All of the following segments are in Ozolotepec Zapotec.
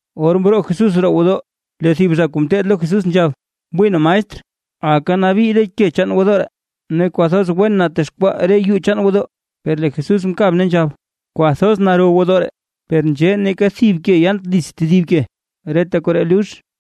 Or mroo Jesús roo gwodoo lee thib zha kuu ngeteed lo Jesús nzhab: ―¡Wii na, maestr! ¡Aka nabii re ke chaan gwodoo ree, ne kwathoz wen natexkwaa re yuu chaan gwodoo! Per lee Jesús mkab ne nzhab: ―Kwathoz naro gwodoo ree. ¡Per nzhee neeka thib ke yaant dits tedib ke, reta koree lux!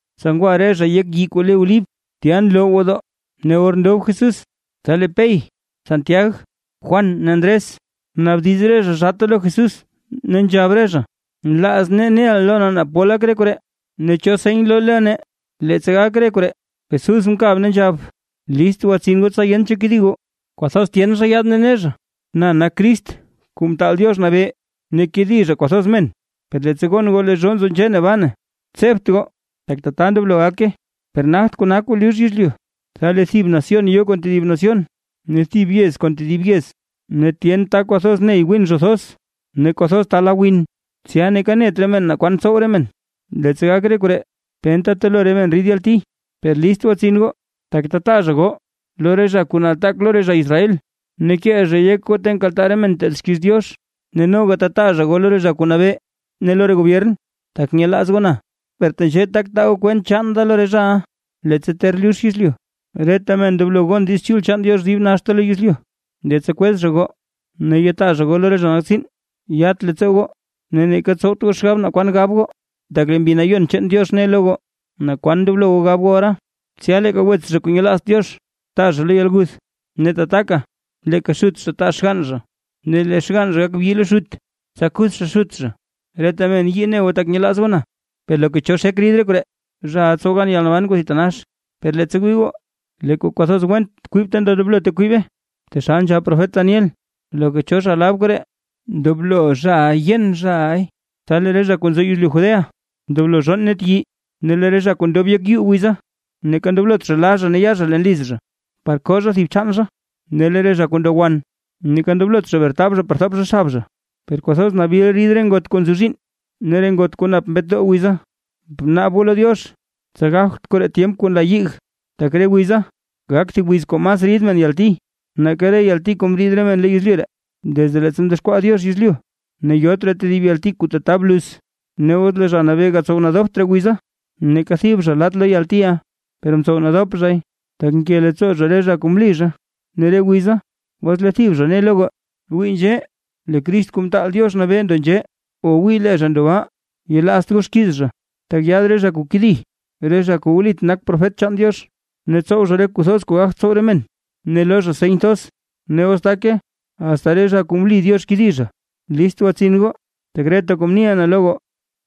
Tsa ngwa re zha yek thib yii kuu le Olib, tya nloo gwodoo, ne or ndob Jesús, tsa lee Pey, Santiag, Juan ne Ndres, mnaabdiz re zha zhaata lo Jesús, ne nzhab re zha: ―Nlaaz nee neʼa loo nee naa pol gak re koree. ¿Ne cho seny loo lo nee, leettsa gak re koree? Jesús mkab ne nzhab: ―List gwatsin goo tsa yent cho kedi goo. Kwathoz tyen zha yaad ne ne zha: “Na nak Crist Kuu Mtaal Diox Nabee”. Ne kedi zha kwathoz men. ’Per leettsa gon goo lee zhoo nzo nzhee ne baa, tsebt goo, tak tata ndoblo gake, per nagt kona kuu lux yezlyu. Tsa lee thib nación yo kon tedib nación, ne thib yez kon tedib yez ne tyen ta kwathoz ney gwin zho thoz, ne kwathoz ta la win, tsya neeka net re men naa kwan tsow re men, leettsa gak re koree, penta telo re men rid yalti. ’Per list gwatsin goo, tak tataa zha goo lo re zha kuu nataak lo re zha Israel, ne kee zhay yek goo ta nkaltaa re men nteed xkiiz Diox. Ne noga tataa zha goo lo re zha kuu nabee ne lo re gobyern, tak nyelaaz goo na. Per tenzhee tak taa goo kwent chaan da lo re zhaʼa. Leettsa ter lux yezlyu, reta men ndoblo gon Diiz Chul chaan Diox dib naxta lo yezlyu. Leettsa kwez zha goo ne yataa zha goo lo re zha nak tsiin; yat leettsoo goo ne neeka tsowt goo xgab naa kwan gab goo, tak lee Mbi Nayon chaan Diox ne lo goo naa kwaan ndoblo goo gab goo ora. Tsya leeka wets zha kuu nyelaazt Diox taa zha lo yalguth; ne tataka leeka xut zha taa xgann zha; ne lee xgann zha gak bi lo xut, tsa kuth zha xut zha. Reta men yii ne goo tak nyelaaz goo na, per loka cho xek rid re koree, zhaʼa tsow gan yalnaban kuu thitanax. ’Per leettsa wii goo, lee kuu kwathoz went kwib ta ndoblote kwibe, taxal nzhab profet Daniel. (Loka cho zha lab koree, ndoblo zhaʼa yen zhaʼay.) Tsa lee re zha kuu nzo yezlyu Judea ndoblo zhonn net yii. Ne lee re zha kuu ndob yek yuu wiza, neeka ndoblot la zha ne ya zha leen liz zha, par koo zha thib chaan zha; ne lee re zha kuu ndo wan, neeka ndoblot zha bretab zha par thop zha xab zha. ¡Per kwathoz nabil rid re ngot kuu nzozhiinn ne re ngot kuu nap mbetdoo wiza! Bnaab goo lo Diox, tsa gagt koree tyemp kuu nla yig. Tak lee re wiza, gak thib wiz kuu mas rid re men yalti, nake reta yalti kuu mriid re men lo yezlyu ree, desde leettsa mdexkwaa Diox yezlyu, ne yot raa tedib yalti kuu tata bluz. Ne os lee Zha Nabee gatsow nadopt re wiza, neeka thib zha laat lo yaltiʼa, per mtsow nadop zhay, tak nke leettsoo zha re zha kuu mli zha. ’Ne re wiza, os lee thib zha ne lo goo: “Wii nzhee, lee Crist Kuu Mtaal Diox Nabee ndo nzhee”. O “wii lee zha ndo baa”, yelaazt goo xkiiz zha. Tak yaad re zha kuu kedi; re zha kuu wlit nak profet chaan Diox, ne tsow zha re kuu thoz kuu gagt tsow re men, ne loo zha seny thoz, ne os take, asta re zha kuu mli Diox kedi zha. List gwatsin goo, tak reta kuu mniʼa na lo goo.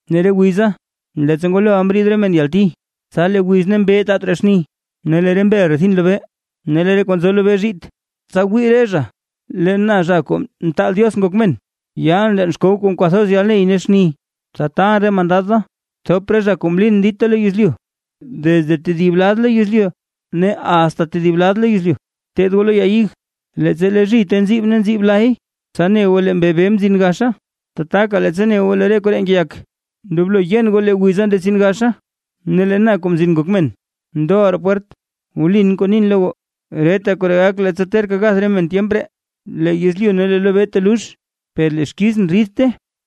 ’Ne re wiza, leettsa ngwaloʼa mriid re men yalti, tsa lee wiz ne mbee taat raa xni. Ne lee re mbel rethin lobee, ne lee re kuu nzo lobee zhiit. Tsa wii re zha lee na Zha Kuu Mtaal Diox Ngok Men, yaalʼn leen xkow kon kwathoz yalney ne xni. Tsa taalʼn re mandad da thop re zha kuu mlin dita lo yezlyu, desde thib lad lo yezlyu ne asta tedib lad lo yezlyu. ’Bteed goo lo ya ig, leettsa lee zhite nziib ne nziib lay, tsa ne goo lee mbee beyi mzin gaxa. Tataka leettsa ne goo lee re koree ngeyak, ndoblo yen goo lee wiza ndetsin gaxa. Ne lee na, Kuu Mzin Ngok Men, ndoʼa roo pwert. Wlin kuu nin lo goo, reta koree gak leettsa terka gath re men tyemp ree. Lee yezlyu ne lee lo lobee telux per lee xkizʼn ridte,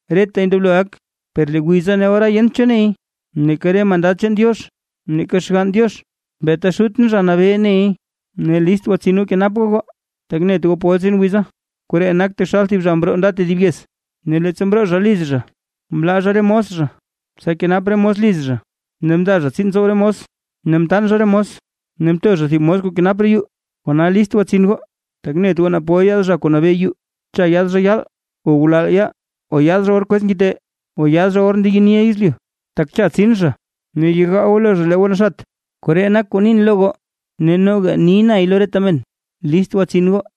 retay ndoblo gak. ’Per lee wiza ne ora yent cho ney; neeka re mandad chaan Diox, neeka Xgann Diox, beeta Xutʼn Zha Nabee ney. ’Ne list gwatsin goo kenap goo goo, tak net goo pol tsin wiza. Koree nak taxal thib zha mroo nda tedib yez. Ne leettsa mroo zha liz zha mlaa zha re mos zha, tsa kenap re mos liz zha. Ne mndaa zha tsiin tsow re mos, ne mtaan zha re mos, ne mto zha thib mos kuu kenap roo yuu. Kona list gwatsin goo, tak net goo naa pol yaad zha kuu nabee yuu. Cha yaad zha yaal, o ngulal yaal, o yaad zha or kwez ngite, o yaad zha or ndeyeniʼa yezlyu. Tak cha tsin zha ne yegaa goo lo zha lee goo naxat. Koree nak kuu nin lo goo ne noga ni nay lo reta men: List gwatsin goo.